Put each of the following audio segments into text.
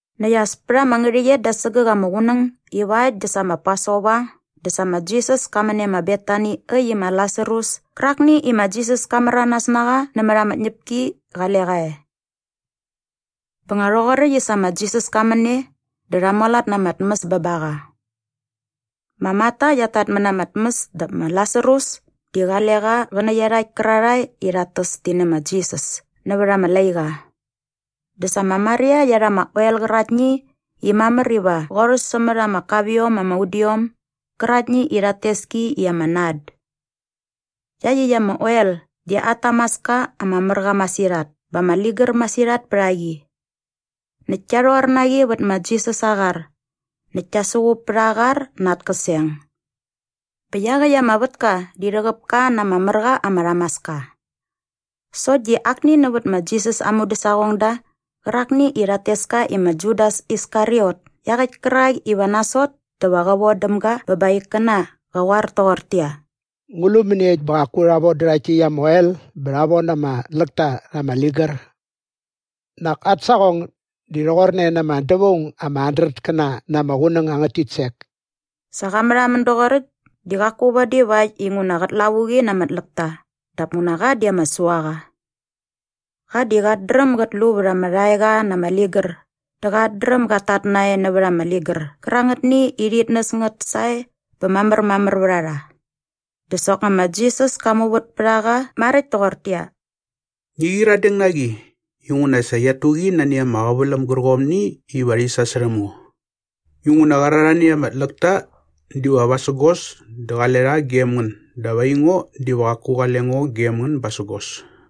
Näkt as pät ama ngärhäqyet da sägäk ama qunäng iva äkt dä sa ma Pasova dä sa ma Jisas ka män e ma Betani äkt i ma Lasarus kärakni i ma Jisas ka märanas na qa nämät ama tñäpki qale qa e. Bä nga rhoqoräkt i sa ma Jisas ka män e dä rha mualat na ama tmäs bä ba qa. Ma Marta qiat tatmät na ama tmäs dap ma Lasarus di qale qa qä nä iarhakt kärarhae i rhat täs ti nä ma Jisas nävät ama laiqa. Dä sa ma Maria qia rha ama oel qäraktni i mamär iva qorhäs sämät ama kapiom ama udiom gäraktni i rhat tes ki i ama nard. Iaqyäkt ama oel di at tamaska ama mär qa masirhat bä ama ligär masirhat pät a qi. Näkt kia rhor na qi vät ma Jisas aa qar näkt kia suqup pät aa qar na at käseng. Bä iaqäkt ama vätka di rhäqäp ka na ama mär qa ama rhamaska. Sokt di akni nävät ma Jisas aa mudäsaqongda qärakni i rhat tes ka i ma Judas Iskariot iaqäkt kärak iva nasot dä va qä vodäm ga bä ba aa ikkäna qa qoar toqortäqyia, “Ngu lu mäniekt bä qaku rha vodä rhakt täkt ama oel bä rha von ama tläkta rha ama ligär? Nak at saqong di rhoqorne na ama dävaung ama handretkäna na ama qunäng angät titsek.” Sa qa märhamän doqoräkt di qaku vadi vakt inguna qät lavuqi na ama tläkta dap nguna qa di ama suaqa. Qa di qat dräm gat lu vät ama rhaeqa na ama ligär dä qat dräm gat tat nae nävät ama ligär qärangätni i rhit näs ngät sae bä mamärmamär vät a qa. Dä soknga ma Jisas ka muvät pät a qa maräkt toqortäqyia, “Ngi qyiradeng na qi inguna sa qiat tu qi nani ama qäväläm gärqomni iva rhi sasärhäm ngo. Inguna qärarhani ama tläkta diva vasägos dä qale rha gem ngän dap aingo diva qaku qale ngo gem ngän basägos.”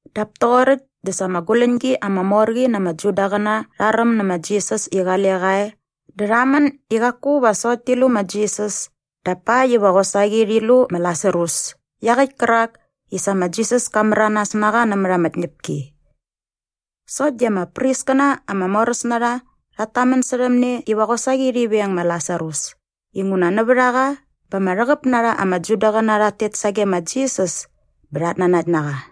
Dap toqoräkt dä sa ama guläñgi ama mor qi na ama Judaqäna rha räm nä ma Jisas i qale qa e dä rha män i qaku va sokt ti lu ma Jisas dap pakt iva qosaqi rhi lu ma Lasarus iaqäkt kärak i sa ma Jisas ka märanas na qa nämät ama tñäpki. Sokt di ama priskäna ama moräs na rha rhat tamän särhäm ne iva qosaqi rhi veng ma Lasarus inguna nävät a qa bä ama rhäqäp na rha ama Judaqäna rhat tet sage ma Jisas bä rhat nanakt na qa.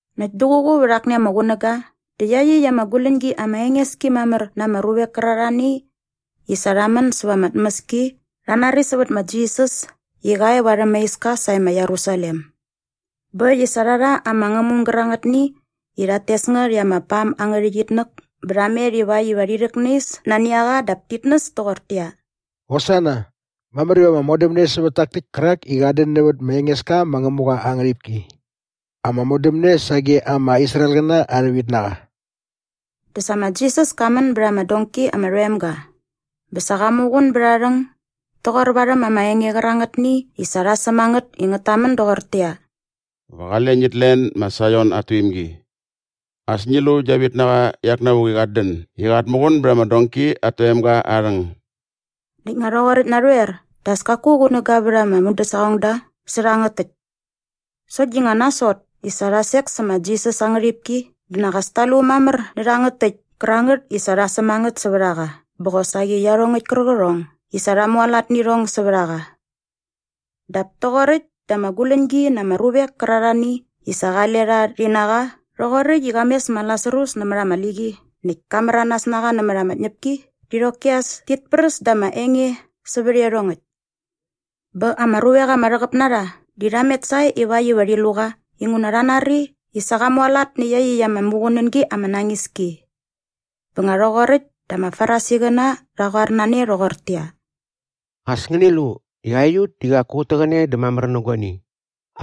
Näkt duququ vät akni ama qunäga dä iaqyäkt ama guläñgi ama enges ki mamär na ama ruvek kärarhani i sa rha män säva ama tmäski rha nari sävät ma Jisas i qa e varhäm aa iska sae ma Jerusalem. Bä äkt i sa rha rha ama ngämung gärangätni i rhat tes ngät i ama pam angä rhäqyitnäk bä rha met ivakt iva rhi rhäknais nani a qa dap tit näs toqortäqyia, “Hosana! Mamär iva ama modämne sävät tak täkt kärak i qat dän nävät ma Engeska ma Ngämuqa aa ngärhipki! Ama modämne sage ama Israelqäna arha vitnaqa!” Dä sa ma Jisas ka män bät ama donki ama rhoem ga bä sa qa muqun bät aa rhäng doqor varhäm ama enge qärangätni i sa rha säm a ngät i ngät tamän doqortäqyia, “Va qale ngit len ma Saion at tuimgi. As ngi lu gia vitnaqa iak navuk i qat dän i qat muqun bät ama donki at toemga aa rhäng.” Näkt nga rhoqoräkt narhoer dä as kaku qunäga vät aa mudäsaqongda sä rhangät täkt. Sokt di nga nasot i sa rha sek sä ma Jisas aa ngärhipki dä nak as ta lu mamär nä rhangät täkt kärangät i sa rha säm a ngät sävät a qa bä qosaqi iarhongäkt kärqärhong i sa rha mualat nä irhong sävät a qa. Dap toqoräkt dä ama guläñgi na ama ruvek kärarhani i sa qale rha rhi na qa rhoqoräkt i qa mes ma Lasarus nämät ama liqi näkt ka märanas na qa nämät ama tñäpki di qoki as tit präs dä ama enge sävät iarhongäkt. Bä ama ruvek ama rhäqäp na rha di rha met sae ivakt iva rhi lu qa inguna rha nari i sa qa mualat nä iaqyäkt ama muqunängi ama nañis ki. Bä nga rhoqoräkt dä ama Farisiqäna rha qoar na ne rhoqortäqyia, “As ngäni lu i aiut di qaku ut täqäne dä mamär nä guani.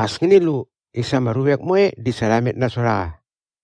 As ngäni lu i sa ama ruvek moe di sa rha met nasot a qa!”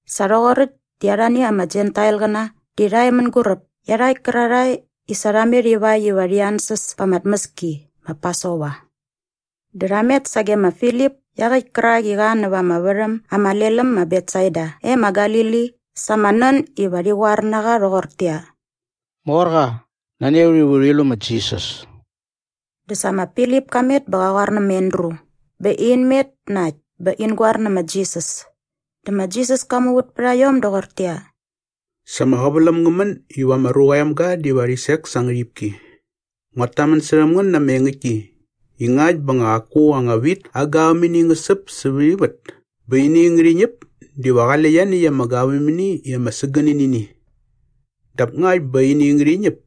Sa rhoqoräkt di arhani ama Jentailqäna di rha e mänguräp iarhakt kärarhae i sa rha met ivakt iva rhi ansäs pa ama tmäski ma Pasova. Dä rha met sage ma Filip iaqäkt kärak i qa näva ama värhäm ama lel äm ma Betsaida e ma Galili sa ama nän i rha qoar na qa rhoqortäqyia, “Morqa, nani a ut iva urhi lu ma Jisas.” Dä sa ma Filip ka met bä qa qoar nä ma Andru bä in met na äkt bä in goar nä ma Jisas. Dä ma Jisas ka muvät pät a iom doqortäqyia, “Sa ama qäväläm ngä män iva ma Ruqa aa Emga diva rhi sek sa aa ngärhipki. Nguat tamän särhäm ngän na ama engäktki i ngakt bä nga qaku anga wit aa gavämini ngä säp sävät ivät bä ini ngärhi ñäp diva qale ianiäkt ama gavämini i ama sägäni nä ini. Dap ngakt bä ini ngärhi ñäp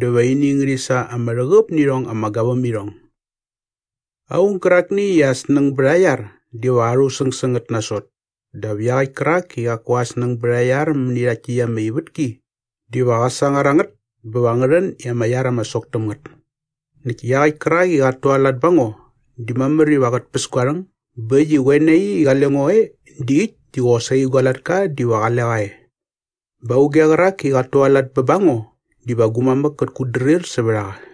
dä va ini ngärhi sa ama rhäqäp nä irhong ama gavämirhong. Aung gärakni i aa snäng bät aa iar diva qa rhusäng sä ngät nasot dap iaqäkt kärak i qaku aa snäng bät aa iar mäni rhakt täkt ama ivätki diva qä sangar a ngät bä va ngä rhän i ama iar ama sok täm ngät. Näkt iaqäkt kärak i qat tualat ba ngo di mamär iva qät päs gua rhäng bä äkt i qoe nai i qale ngo e di äkt di qosaqi gua latka diva qale qa e. Bä auge qärak i qat tualat bä ba ngo diva gu mamäk kät kutdrir sävät a qa.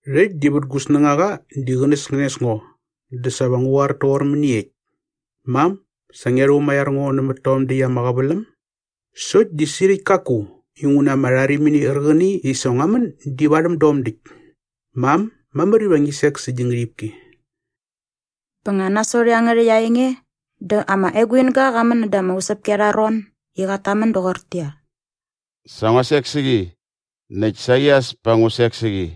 “Rhäkt di vät gu snängaqa di qänäskänes ngo dä sa va ngu qoar toqor mäniekt? ‘Mam, sa ngia rhumaiar ngo nämät tom däkt ama qäväläm’? Sokt di sirhäkt kaku inguna ama rharimini qärqäni i sa ngua män di varhäm dom däkt. Mam, mamär iva ngi sek sä gi ngärhipki!” Bä nga nasot iangärhäkt aa enge dä ama eguinga qa män näda ama usäpki arha ron i qat tamän doqortäqyia, “Sa ngua sek sä qi näkt saqi as pa ngu sek sä qi.”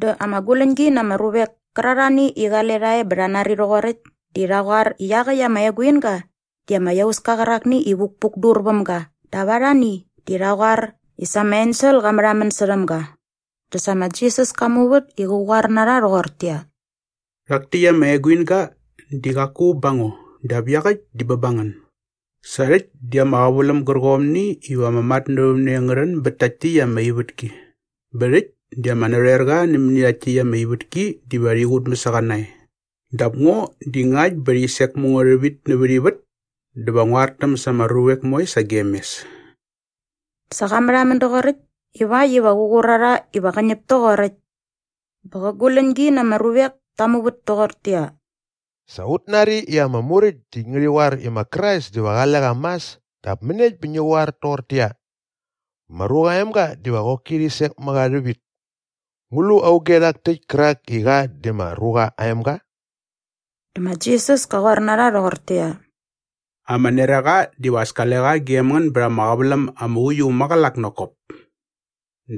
Dä ama guläñgi na ama ruvek kärarhani i qale rha e bä rha nari rhoqoräkt di rha qoar i iaqäkt ama eguinga di ama iauska qärakni i vukpukdur väm ga dap arhani di rha qoar i sa ama ensel qa märhamän särhäm ga. Dä sa ma Jisas ka muvät i qä qoar na rha rhoqortäqyia, “Rhak täkt ama eguinga di qaku ba ngo dap iaqäkt diva bä ba ngän. Sa rhäkt di ama qäväläm gärqomni iva ama matnävämne ngä rhän bät takt täkt ama ivätki bä rhäkt di ama narhoerqa nämäni rhakt täkt ama ivätki diva rhi qutmäs a qa nae. Dap ngo di ngakt bä rhi sek mä ngo rhävit nävät ivät dä va ngu artäm sa ama ruvek moe sagem mes.” Sa qa märhamän doqoräkt ivakt iva qä qur a rha iva qä ñäp toqoräkt. Bä qä guläñgi na ama ruvek ta muvät toqortäqyia, “Sa ut nari i ama Muräkt di ngärhi qoar i ma Krais diva qale qa mas dap mäniekt bä ngi qoar toqortäqyia, ‘Ma Ruqa aa Emga diva qoki rhi sek mä qa rhävit’? Ngu lu auge rhak täkt kärak i qa di ma Ruqa aa Emga?” Dä ma Jisas ka qoar na rha rhoqortäqyia, “Ama neraqa diva as kale qa gem ngän bät ama qäväläm ama uiu äm maqälak nak kop.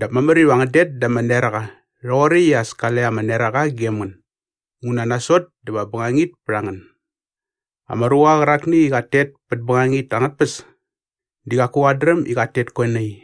Dap mamär iva ngän det da ama neraqa rhoqoräkt i as kale ama neraqa gem ngän inguna nasot dä va bängangit pät a ngän. Ama ruqa qärakni i qat tet pät bängangit angät tpäs di qaku qat dräm i qat tet koe nai.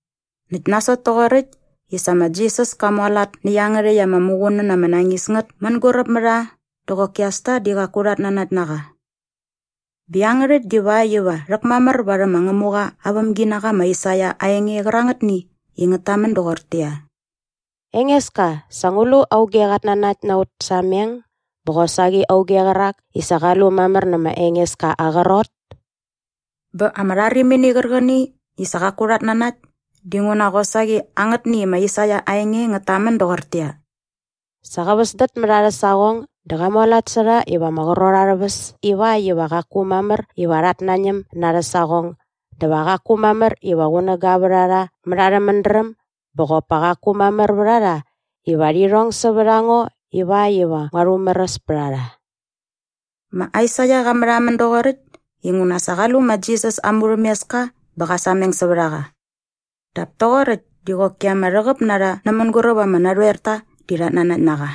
Näkt nasot toqoräkt i sa ma Jisas ka mualat nä iangärhäkt ama muqunän ama nañis ngät mänguräp mä rha dä qoki as ta di qaku rhat nanakt na qa. Bä iangärhäkt divakt iva rhäkmamär varhäm ma Ngämuqa aa vämginaqa ma Aisaia aa enge qärangätni i ngät tamän doqortäqyia, “Engeska, sa ngu lu auge qat nanakt na aut sameng bä qosaqi auge qärak i sa qa lu mamär nä ma Engeska aa qrot?” Bä ama rharimini qärqäni i sa qaku rhat nanakt dinguna qosaqi angätni ma Aisaia aa enge ngät tamän doqortäqyia, “Sa qa väsdät mät arhä saqong dä qa mualat sä rha iva ama qrot arhä väs ivakt iva qaku mamär iva rhat nañäm na arhä saqong dä va qaku mamär iva qunäga vät a rha mät arhä mädräm bä qop pa qaku mamär vät a rha iva rhi rhong sävät a ngo ivakt iva ngua rhumäräs pät a rha.” Ma Aisaia qa märhamän doqoräkt inguna sa qa lu ma Jisas aa murhämeska bä qa sameng sävät a qa. Dap toqoräkt di qoki ama rhäqäp na rha nä mänguräp ama narhoerta di rhat nanakt na qa.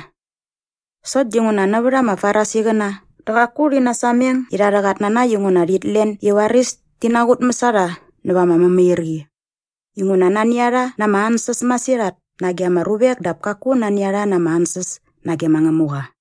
Sokt dinguna nävät ama Farisiqäna dä qaku rhi nasameng irha arhä qatnanakt inguna rhit len i varis ti naqutmäs a rha näva ama mämairqi inguna nani a rha na ama ansäs masirhat nage ama ruvek dap kaku nani a rha na ama ansäs nage ma Ngämuqa.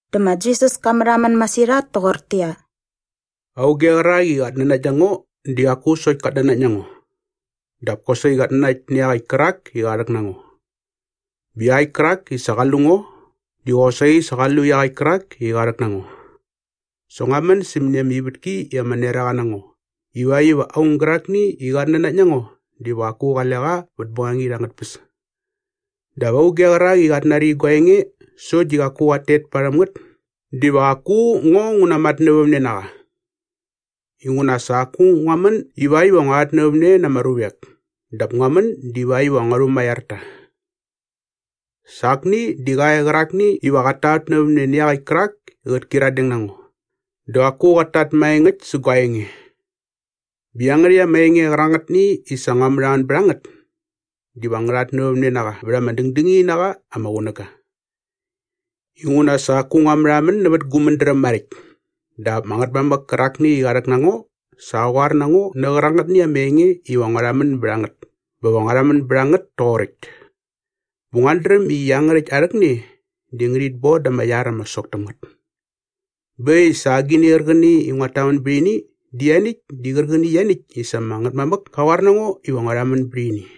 Dä ma Jisas ka märhamän masirhat toqortäqyia, “Auge qärak i qat nanakt na ngo di qaku sokt kat nanakt na ngo dap kosaqi qat nanakt nä iaqäkt kärak i qa rhäk na ngo. Bä iaqäkt kärak i sa qa lu ngo di qosaqi sa qa lu iaqäkt kärak i qa rhäk na ngo. Sa ngua män sämäni ama ivätki i ama neraqa na ngo ivakt iva aung gärakni i qat nanakt na ngo diva qaku qale qa vät bängangit angät tpäs. “Dap auge qärak i qat nari gua enge sokt di qaku qat tet parhäm ngät diva qaku ngo ngu namatnävämne na qa. Inguna sa qaku ngua män ivakt iva ngua rhatnävämne na ama ruvek dap ngua män divakt iva ngua rhumaiar ta. Sa akni di qa e qärakni iva qat tatnävämne nä iaqäkt kärak i qät kyiradeng na ngo dä qaku qat tat maengäkt sä gua enge. Bä iangärhäkt ama enge qärangätni i sa ngua märhamän bät a ngät diva ngä rhatnävämne na qa vät ama dängdängini na qa ama qunäga. Inguna sa qaku ngua märhamän nävät gu mädräm maräkt dap ama Ngätmamäk kärakni i qa rhäk na ngo sa qa qoar na ngo nä qärangätni ama enge iva ngua rhamän bät a ngät bä va ngua rhamän bät a ngät toqoräkt. Bä nguat dräm i iangärhäkt aa rhäkne di ngärhit bon da ama iar ama sok täm ngät. Bä äkt i sa agini qärqäni i nguat tamän bät ini di ianiäkt di qärqäni ianiäkt i sa ama Ngätmamäk ka qoar na ngo iva ngua rhamän bät ini.”